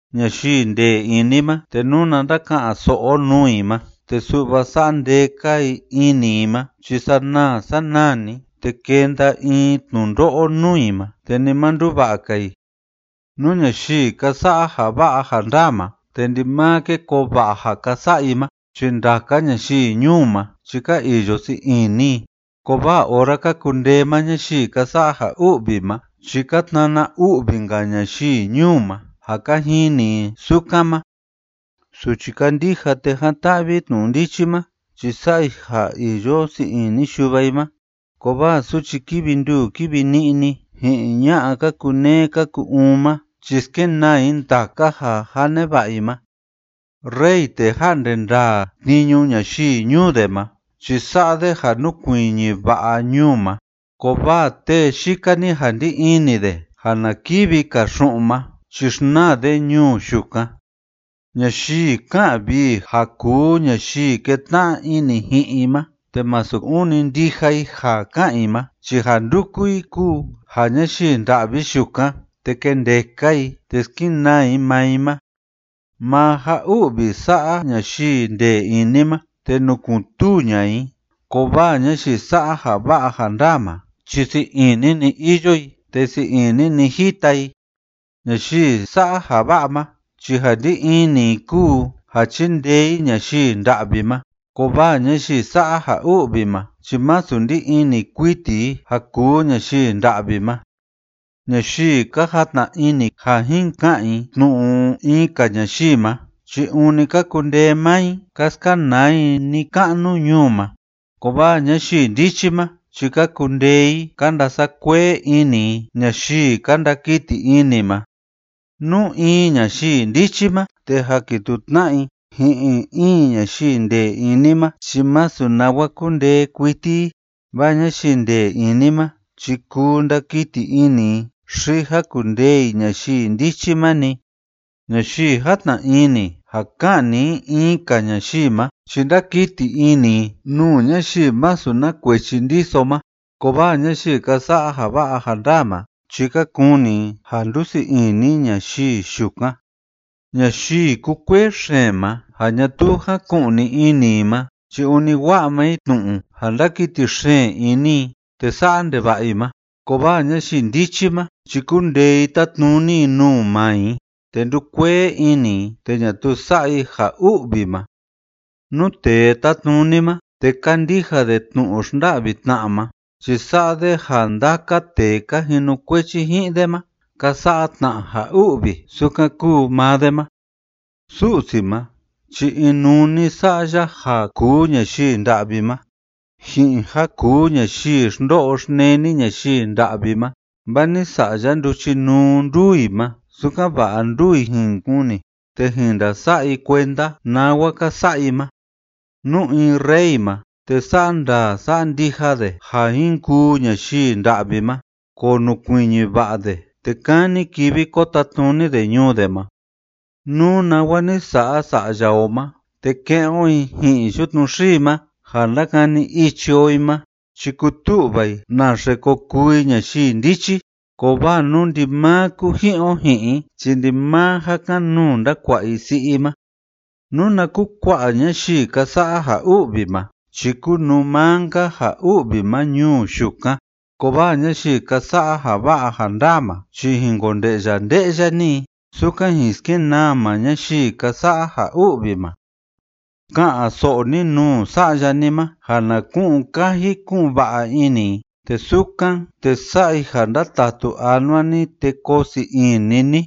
Ñayii ndee ini ma, te nuna ndaka'an‑so'o o nuu i ma, te su'va sa'a ndee‑ka i ini i ma chi sanaa sanaa‑ni, te kenda in tnundo'o nuu i ma, te ni ma nduva'a‑ka i. Nú ñayii ka sa'a ja va'a ja ndaa ma te ndimaa ke koo va'a ja ka sa'a i ma chi ndaka ñayii ñuu ma chi ka iyo sii ini i, kovaa ora ka kundee maa ñayii ka sa'a ja u'vi ma chi ka tnana u'vi‑nka ñayii ñuu ma ja ka jini i sukan ma. Suchi kándija te jan‑ta'vi i tnu'u ndichi ma chi sa'a i ja iyo sii ini yuva i ma, kovaa suchi kívi nduu kívi ni'ni ji'in ña'a ka kuneé ka ku‑uun ma chi skenaa i ndaka ja jâ neva'a i ma. Rey tee ja'nde ndaa tniñu ñayii ñuu de ma chi sa'a de ja núkuiñi va'a ñuu ma, kovaa tee yika‑ni ja ndí ini de ja na kivi‑ka xu'un ma chi xnaa de ñuu yukan. Ñayii ká'an vii ja kuu ñayii ketna'a ini ji'in i ma te masu ûni ndija i ja ká'an i ma chi ja ndúku i kúu ja ñayii nda'vi yukan te kendeka i te skenaa i maa i ma. Maa ja u'vi sa'a ñayii ndee ini ma, te nukun‑tuu ña'a i, kovaa ñayii sa'a ja va'a ja ndaa ma chi sii ini‑ni iyo i te sii ini‑ni jita i. Ñayii sa'a ja va'a ma chi ja ndí ini i kúu ja chindee i ñayii nda'vi ma, kovaa ñayii sa'a ja u'vi ma chi masu ndí ini kuiti i ja kuu ñayii nda'vi ma. Ñayii ka jatna ini ja jin ka'an i tnu'u in‑ka ñayii ma chi ûni ka kundee maa i ka skanaa i ni‑ka'nu ñuu ma, kovaa ñayii ndichi ma chi ka kundee i ka ndasa'a kuee ini i ñayii ka ndakiti ini ma. Nú in ñayii ndichi ma, te jakituu tna'a i ji'in in ñayii ndee ini ma, chi masu nawa kundee kuiti i, vaa ñayii ndee ini ma chi kuu ndakiti ini i xi jakundee i ñayii ndichi ma‑ni. Ñayii játna ini ja ka'ni i in‑ka ñayii ma chi ndákiti ini i nuu ñayii masu na kuechi ndiso ma, kovaa ñayii ka sa'a ja va'a ja ndaa ma chi ka kuni i ja ndusii ini ñayii yukan. Ñayii kúkuee xeen ma ja ñatuu jáku'ni ini i ma chi ûni wa'a maa i tnu'u ja ndákiti xeen ini i te sa'a ndeva'a i ma, kovaa ñayii ndichi ma chi kúndee i tátnuni i nuu maa i, te ndúkuee ini i, te ñatuu sa'a i ja u'vi ma. Nú tee tátnuni ma, te kándija de tnu'u xnda'vi tna'a ma, chi sa'a de ja ndaka tee ka jinukuechi ji'in de ma ka sa'a tna ja u'vi sukan kúu maa de ma. Su'si ma chi inuu‑ni ni sa'a ya ja kuu ñayii nda'vi ma ji'in ja kuu ñayii xndo'o xneni ñayii nda'vi ma, vaa ni sa'a ya nduchinuu nduu i ma, sukan‑va'a nduu i jin kuni te jin ndasa'a i kuenda nawa ka sa'a i ma. Nú in rey ma, te sa'a ndaa sa'a ndija de ja jin kuu ñayii nda'vi ma, konukuiñi va'a de te kani kivi ko tatnuni de ñuu de ma. Nú nawa ni sa'a sa'ya o ma, te ke'en o i ji'in yutnu xii ma ja ndakani ichi o i ma, chi kutu'va i naxe ko kuu i ñayii ndichi, kovaa nú ndimaa kuji'in o ji'in i chi ndimaa ja kan‑nuu ndakua'a i si'i i ma. Nuna kukua'a ñayii ka sa'a ja u'vi ma chi kúnuu maa‑nka ja u'vi ma ñuu yukan, kovaa ñayii ka sa'a ja va'a ja ndaa ma, chi jin konde'ya nde'ya‑ni i sukan jin skenaa maa ñayii ka sa'a ja u'vi ma. Ka'an‑so'o ni nuu sa'ya ni ma ja na ku'un kaji ku'un va'a ini i, te sukan, te sa'a i ja ndatatu anua ni te koo sii ini ni.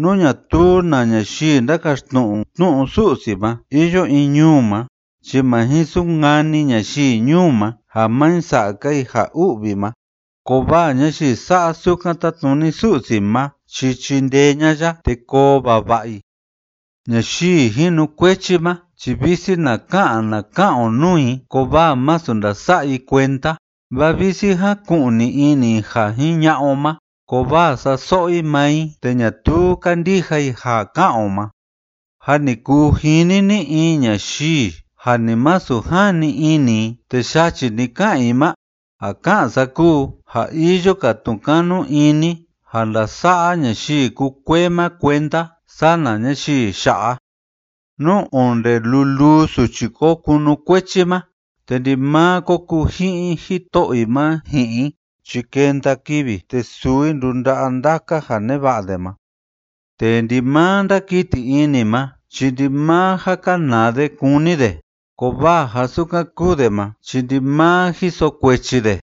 Nú ñatuu na ñayii ndakaxtnu'u tnu'u Su'si ma iyo in ñuu ma chi ma jin sunkani ñayii ñuu ma ja ma jin sa'a‑ka i ja u'vi ma, kovaa ñayii sa'a sukan tátnuni Su'si ma chi chindee ña'a ya te koo vava'a i. Ñayii jinukuechi ma chi visi na ka'an na ka'an o nuu i kovaa masu ndasa'a i kuenda, vaa visi jaku'ni ini i ja jiña'a o ma, kovaa sa'a so'o i maa i te ñatuu kándija i ja ká'an o ma. ¿Jâ ni kuu jini ni in ñayii ja ni masu jani ini i te yachi‑ni ká'an i ma? Ja ká'an sa kúu ja iyo‑ka tnu'u kanu ini ja ndasa'a ñayii kúkuee ma kuenda sana ñayii ya'a. Nú onde luluu suchi ko kunukuechi ma, te ndimaa ko kuji'in jito'o i ma ji'in i chi kenda kivi, te suu i ndunda'a ndaka ja neva'a de ma. Tee ndimaa ndákiti ini ma chi ndimaa ja kanaa de kúni de, kovaa ja sukan kúu de ma chi ndimaa jiso kuechi de.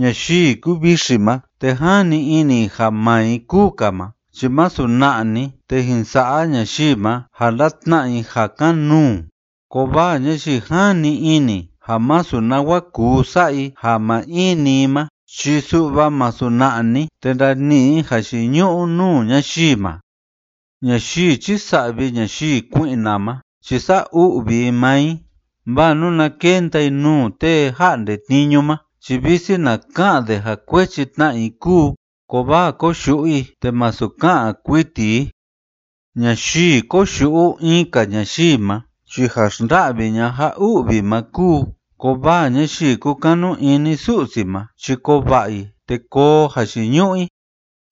Ñayii kúvixi ma te jani ini i ja maa i kúu‑ka ma chi masu na'a‑ni te jin sa'a ñayii ma ja ndatna'a i ja kan‑nuu, kovaa ñayii jani ini ja masu nawa kuu sa'a i ja maa in‑ni i ma chi su'va masu na'a‑ni te ndani'i i jayiñu'u nuu ñayii ma. Ñayii chísa'vi ñayii kui'na ma chi sa'a u'vi i maa i, vaa nuna kenda i nuu tee ja'nde tniñu ma chi visi na ka'an de ja kuechi tna i kúu, kovaa koyu'u i te masu ka'an kuiti i. Ñayii koyu'u in‑ka ñayii ma chi ja xnda'vi ña'a ja u'vi ma kúu, kovaa ñayii kúkanu ini Su'si ma chi koo va'a i te koo jayiñu'u i.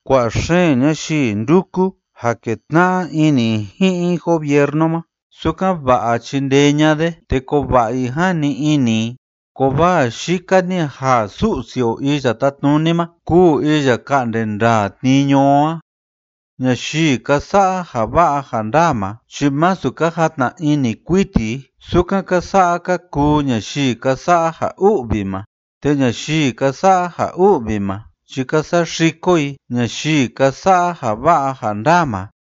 Kua'a xeen ñayii ndúku ja ketna'a ini i ji'in gobiernu ma, sukan‑va'a chindee ña'a de te koo va'a i, jani ini i, kovaa yika‑ni ja Su'si o Iya Tátnuni ma kúu iya ka'nde ndaa tniñu o a. Ñayii ka sa'a ja va'a ja ndaa ma chi masu ka jatna ini kuiti i sukan ka sa'a ka kuu ñayii ka sa'a ja u'vi ma, te ñayii ka sa'a ja u'vi ma chi ka saxiko i ñayii ka sa'a ja va'a ja ndaa ma.